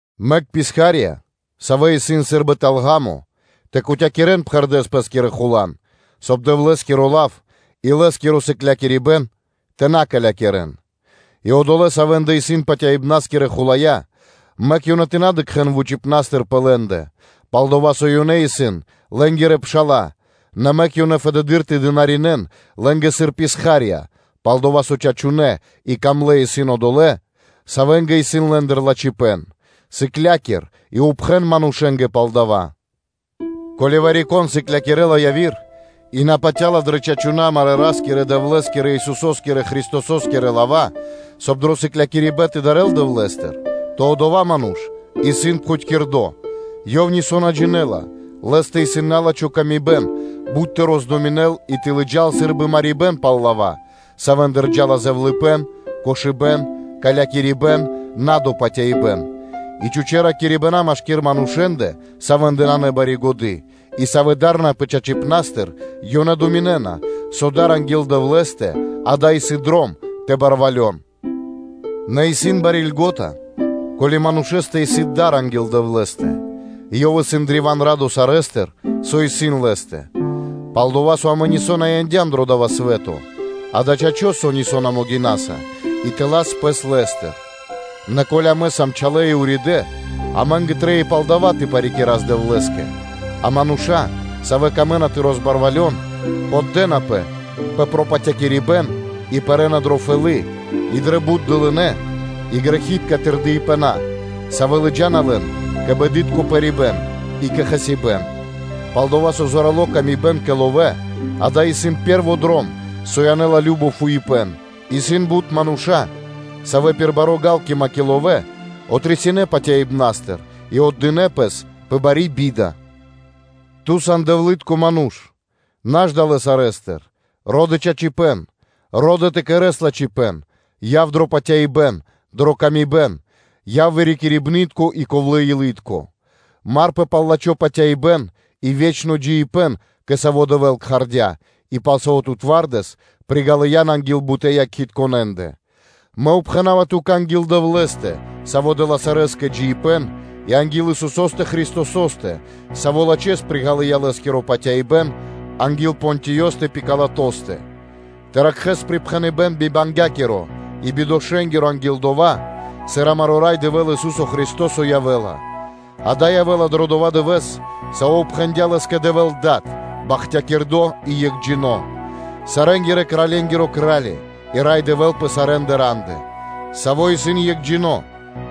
Мэк писха́рья, савэ́ исын сы́рбы тэл ґа́мо, тэ кутякирэн пхэрдэ́с пэ́скирэ хулан, соб (кай) Дэвлэ́скиро лав и Лэ́скиро сыклякирибэ́н тэ на калякирэн. И одолэ́, савэ́ндэ исын патяибнаскирэ хулая́, мэк ёнэ тэ на дыкхэ́н вучипна́стыр пэ лэ́ндэ, пал-дова́ со ёнэ исын лэ́нгирэ пша́ла, нэ мэк ёнэ фэдэды́р тэ дынаринэ́н лэ́нгэ сыр писха́рья, пал-дова́ со чачунэ́ и дро́га исын одолэ́, савэ́нгэ исын лэ́ндыр лачхипэ́н. Сыкля́кир и пхэн зорья́са манушэ́нгэ пал дава́. Ко́ли вари-кон сыклякирэ́ла яви́р и на патя́ла дрэ чачунэ́ амарэ́ Ра́скирэ-Дэвлэ́скирэ, Исусо́скирэ Христосо́скирэ лава́, соб (кай) дро сыклякирибэ́н тэ дарэл Дэвлэ́стыр, то одова́ ману́ш исын пхутькирдо, ёв нисо́ на джинэ́ла, лэ́стэ исын налачхи мысля бут тэ роздуминэл и тэ лыджа́л сы́рбы марибэ́н пал лава́, савэ́ндыр джа́ла зэвлыныпэ́н, кошыбэ́н, калякирибэн, надопатяибэн, и чхучэ́ ракирибэна машки́р манушэ́ндэ, савэ́ндэ нанэ бари годы́, и, савэ́ дарнапэ чачипнастыр, ёнэ думинэ́на, со дар анги́л Дэвлэ́стэ-дава́ исын дром тэ барвалён. Нэ исын бари льго́та, ко́ли манушэ́стэ исын дар анги́л Дэвлэ́стэ и ёв исын древа́н радо сарэ́стыр, со исын лэ́стэ. Пал-дова́ со амэ нисо́ на яндям дро дава́ свэ́то: дава́ чачо́, со амэ нисо́ на могинаса тэ лас лэ́стыр. Нэ ко́ли амэ сам чалэ и уридэ́, амэ́нгэ трэй и пал дава́ тэ парикирас Дэвлэ́скэ. А мануша́, савэ́ камэ́на тэ розбарвалён, поддэнапэ пэ пропатякирибэн и пэрэ́на дрэ фэлы́, и дрэ бут дылынэ́ и грэхи́тка тырдыпэна, савэ́ лыджа́на лэн кэ бэдытко пэрибэн и кэ хасибэ́н. Пал-дова́ со зорало́ тырдыпэ́н кэ ловэ́-дава́ исын пэ́рво дром, со янэ́ла кажно фуипэ́н, исын бут мануша́, савэ́ пир бари ґалкима кэ ловэ́ отрисинэ патяибнастыр и отдынэ́ пэс пэ бари би́да. Ту сан Дэвлы́тко ману́ш, наш далэ́ сарэ́стыр, ро́дэ чачипэ́н, ро́дэ тэ кэрэ́с лачхипэ́н, яв дро патяибэ́н, яв дрэ паты́в кэ яви́р мануша́, яв вырикирибнытко и ковлэ́-илытко. Марпэ пал лачхо́ патяибэ́н и ве́чно джиибэ́н, кэ саво́ тут Дэвэ́л кхардя́, и пал саво́ ту патывалэс приґалыян анги́л бутэ́ якхитконэндэ (свидетелендэ). Мэ упхэнава ту́кэ анги́л Дэвлэ́стэ, Саво́ дэ́ла сарэскэ джиибэ́н, и анги́л Исусо́стэ Христосо́стэ, Саво́ лачхэ́с приґалыя Лэ́скиро патяибэ́н анги́л Понтиёстэ Пилатостэ, тэ ракхэ́с припхэныбэ́н бибангякиро и бидошэ́нгиро анги́л дова́, сыр амаро́ Рай Дэвэ́л, Ису́со Христо́со явэ́ла, дава́ явэ́ла дро дова́ дывэ́с, саво́ упхэндя Лэ́скэ Дэвэ́л Дад, Бахтякирдо́ и Екхджино́, сарэнгирэ-кральенгиро Кра́ли и Рай Дэвэ́л пэ сарэ́ рандэ, Саво́ исын Екхджино́,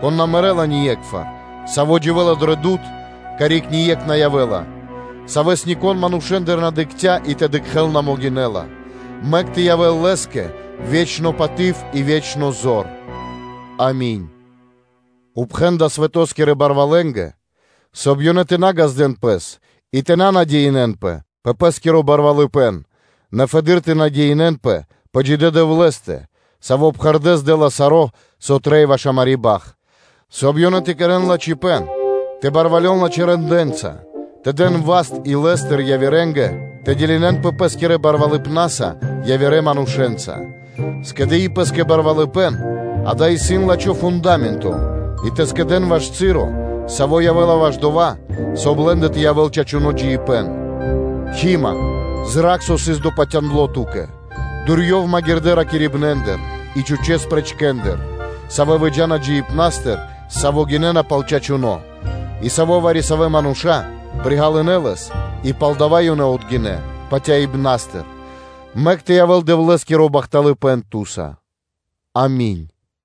Кон на мэрэ́ла ние́кхвар, Саво́ дживэ́ла дро дуд (свэ́то), карик ние́кх на явэ́ла, Савэс нико́н манушэ́ндыр на дыкхця́ и тэ дыкхэ́л на могинэ́ла. Мэк тэ явэ́л Лэ́скэ ве́чно паты́в и ве́чно зор. Ами́нь. Упхэн далэ́ свэто́скирэ барвалэнгэ, соб (кай) ёнэ тэ на ґаздэ́н пэс и тэ на патя́н дро пэ́скиро барвалыпэ́н, нэ фэды́р тэ патял дрэ джидэ́ Дэвлэ́стэ, Саво́ пхэрдэ́с дэ́ла саро́, со трэй ваш амари́ бахт, соб (кай) ёнэ тэ кэрэ́н лачхипэ́н, тэ барвалён лачхэ́ рэндэ́нца, тэ дэн васт илэ́стыр явирэ́нгэ тэ делинэнпэ пэ́скирэ барвалыпнаса явирэ манушэ́нца, скэдыи пэ́скэ кучипэ́н; дава́ исын лачхо́ фунда́менто и тэ скэдэ́н ваш часо, со явэ́ла ваш дова́, соб (кай) лэ́ндэ тэ явэ́л ве́чно джиибэ́н. Химэ, зра́кх, со сыс допатяндло ту́кэ, дурьёв магирдэ́ ракирибнэндыр и чхучэ́ ракирибнэндыр, и захалэ лавэ́ндыр, савэ́ выджа́на джиныбнастыр, саво́ гинэ́на пал чачуно́, и саво́ вари-савэ́ мануша́ приґалынэ лэс и палдава́ ёнэ отгинэ́ патяибнастыр. Мэк тэ явэ́л Дэвлэ́скиро бахталыпэ́н ту́са. Ами́нь.